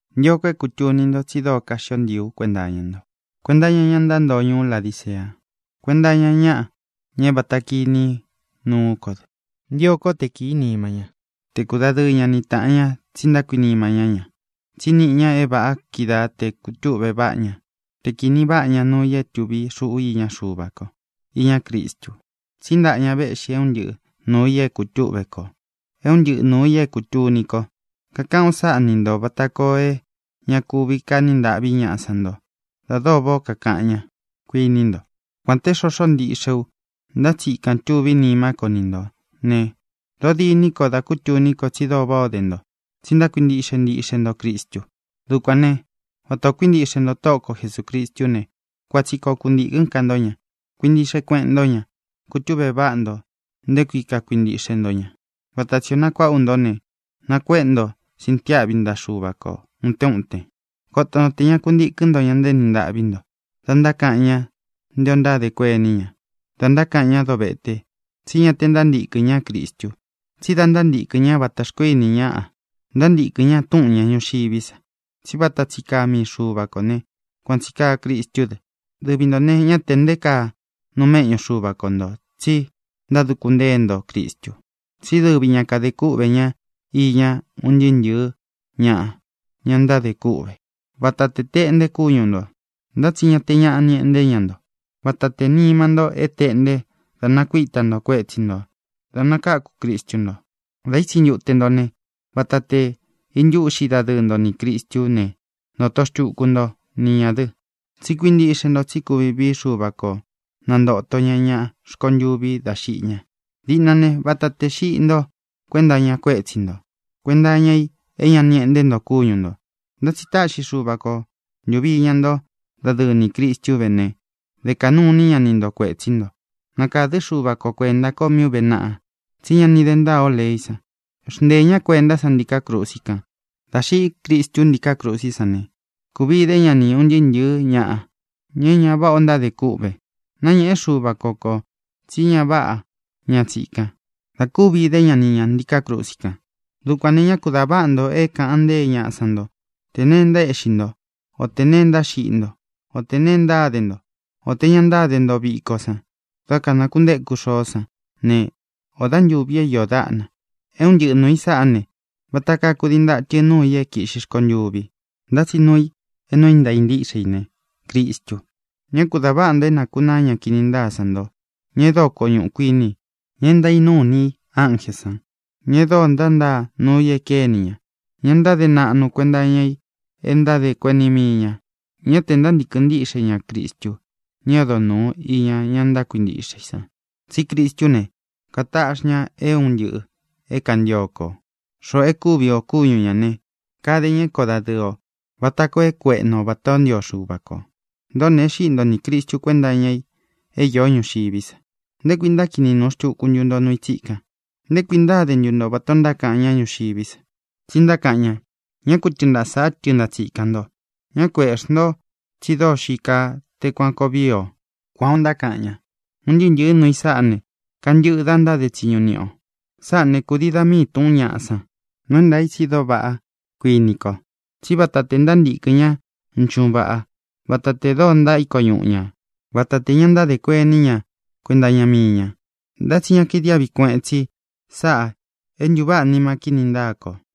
Ntio ko é kūtuni nto tsi dóo kaxio ntii ú kuenta iña nto, kuenta iña ña ntántoo ñuú Ladicea, kuénta iña ñaꞌa, ña é vata kiní nuú ko dɨ. Ntio kó te kīí nima ñá, te kudadɨɨ ña ni tāꞌan ña tsi ntákuinima ñá ña. Tsí niꞌi ña é vāꞌa kídaa tē kutúꞌve váꞌa ña, te kīni váꞌa ña nuu i é tuvi xuꞌu iña Xuva ko, iñá Cristu. Tsí ntaꞌa ña véꞌxi é un ntɨꞌɨ nuū i é kutúꞌve kō, é un ntɨꞌɨ nuū i é kūtuni ko. Kakaꞌán u sáꞌa ni ntō vata koo é ña kuvi kaní ntāꞌví ñaꞌa san nto da dóo váꞌā ó kakaꞌan ñá, kuiní nto. Kuān té xoxó ntiꞌxe u, ntá tsi ikān tuví nimá ko ni ntō né, dōó diní ko da kútuní ko tsi dóo váꞌā ó de nto, tsi ntákuintiꞌxe ntiꞌxe nto Cristu. Dukuān né, vata ō kuíntiꞌxe nto Tóꞌo ko Jesūcristú ne, kuan tsi koo kuntīkɨ́n ka ntó ña. Kuintiꞌxe kueꞌen ntó ña, kutúꞌve váꞌa nto nté kui kakuintíꞌxe nto ña, vata tsī o nakuáꞌa ú nto ne, nakuéꞌe nto sintiáꞌvi ntaꞌa Xuva ko ūtén uten. Koto nto tē ña ku ntíkɨn nto ña ntaéni ntaꞌví nto da ntákaꞌan ña nté ō ntádē kuení ña, da ntákaꞌan ñá dovéte. Tsí ña te ntántīkɨn ñá Cristu, tsí da ntántīkɨn ñá vata xkoó ini ñáꞌa. Ntántīkɨn ña túꞌūn ña ñuxiví sa. Tsí vata tsi kaa mii Xuva kō né, kuan tsī kaa Cristú dɨ. Dɨvi ntō ne, ñá tē nté kaa nuu méꞌñu Xuva ko ntō tsi ntáduku ntée nto Cristu. Tsí dɨvi ña kadē kúꞌvē ñá iña un ntɨɨ́ ntɨ̄ɨ́ ñaꞌa, ña ntádē kûꞌve. Vata tē teꞌnte kúñu ntō, ntá tsi ña te ñaꞌa ni eꞌnté ña nto. Vata tē nima nto é tēꞌnte da nakuíta nto kuétsi ntō da nakáku Cristu nto. Dā ítsi ntute nto ne, vata tē intúꞌxi dadɨɨ nto nī Cristú ne, ntoto xtuku nto ni ñā dɨ, tsi kuíntiꞌxe nto tsí kuvi vií Xuva ko nantōto ña ña rkontuvi dá xiꞌi ña. Diꞌna ne, vata tē xiꞌi ntó kuenta iña kuétsi ntō, kuenta iña i é ña ni eꞌnté nto kúñu ntō. Ntá tsi táꞌxi Xuva ko ntūvi iña nto dadɨ́ɨ ni Cristu vé ne, dē kaꞌnu iní ña ni ntō kuetsí nto. Nakādɨ́ Xuva ko kuenta ko mí ūve naꞌa tsí ña ni de ntáa ō leí san. Xnteē ñá kuentá san ntiká krusi kan. Dā xiꞌí Cristu ntíkā krusí san ne, kūvi dé ña ni ūn ntɨɨ́ ntɨ̄ɨ́ ñaꞌa, ña é ña váꞌa o ntádē kûꞌve. Náñēꞌe Xúva ko kō tsí ña váꞌa ña tsikan da kúvi dé ña ni ñā ntiká krusi kan. Dukuān ne, ñá ku dā váꞌa nto é kāꞌan ntée ñaꞌa san nto tē neé ntaéꞌxi nto, o tē nee ntáxiꞌi nto, o tē nee ntáde nto, o tē ña ntáde nto viko san dá kanakuntéku xoó san ne, ō dá ntuvi é iō dáꞌna. É un ntɨꞌɨ nūu i sáꞌa ne, vata kaa kudii ntatɨ nuu i é kīꞌxi rkontuvi. Ntá tsi nuu i é nuu é ntāa ntíꞌxe i ne, Cristu. Ñá ku dā váꞌa nto é nākunaa ña kini ntáa san nto, ña e dóo koñuꞌu kuini i, ña e ntaínuu ini i ánjē san, ña e dóo ntántaa nuu i e kéni ña, ña ntáde naꞌnu kuenta iña i e ntádē kuení mii ñā. Ñá tē ntántīkɨn ntíꞌxe ña Cristu, ña é odo nūu iña ña ntákuintiꞌxe i san. Tsí Cristú ne, kataꞌxi ña é un ntɨꞌɨ̄ é kantio ko, xoꞌō é kuvi ō kúñu ñā ne, kade ña é koo dadɨɨ ō vata koo é kueꞌnu o vatā ó ntio Xuva kō. Ntōꞌó ne, e xíꞌi nto nī Cristu kuénta iña i é īó ñuxiví sa. ¿Nté kuī ntákini nūu xtuku ntu nto nuu i tsíkan? ¿Nté kuī ntáde ntu nto vatā ó ntákaꞌan ñáꞌa ñuxiví sa? Tsi ntákaꞌan ña: “Ñá ku tɨɨn ntaꞌa sāꞌá tɨɨn ntaꞌa tsikān nto, ñá ku eꞌxī nto, tsi dóo xií kaa té kuān koo vii o”. Kuan ō ntákaꞌan ña. Un ntɨɨ́ ntɨ̄ɨ́ nuu i sáꞌā ne, kantɨꞌɨ da ntáde tsiñu niꞌi ō. Sáꞌā né, kūdii dá mii tūꞌún ñaꞌa san. Nuu é ntaā i tsi dóo vaꞌá, kuini ko, tsí vata tē ntántīkɨn ña nchuꞌún vaꞌá, vata tē dóo ntaíko ñuꞌu ñā, vata te ña ntáde kuení ña kuenta iña mii ña. Ntá tsi ña kaidiáꞌvi kueꞌen tsi sáꞌā e ntuváꞌa nima kíni ntáa kō.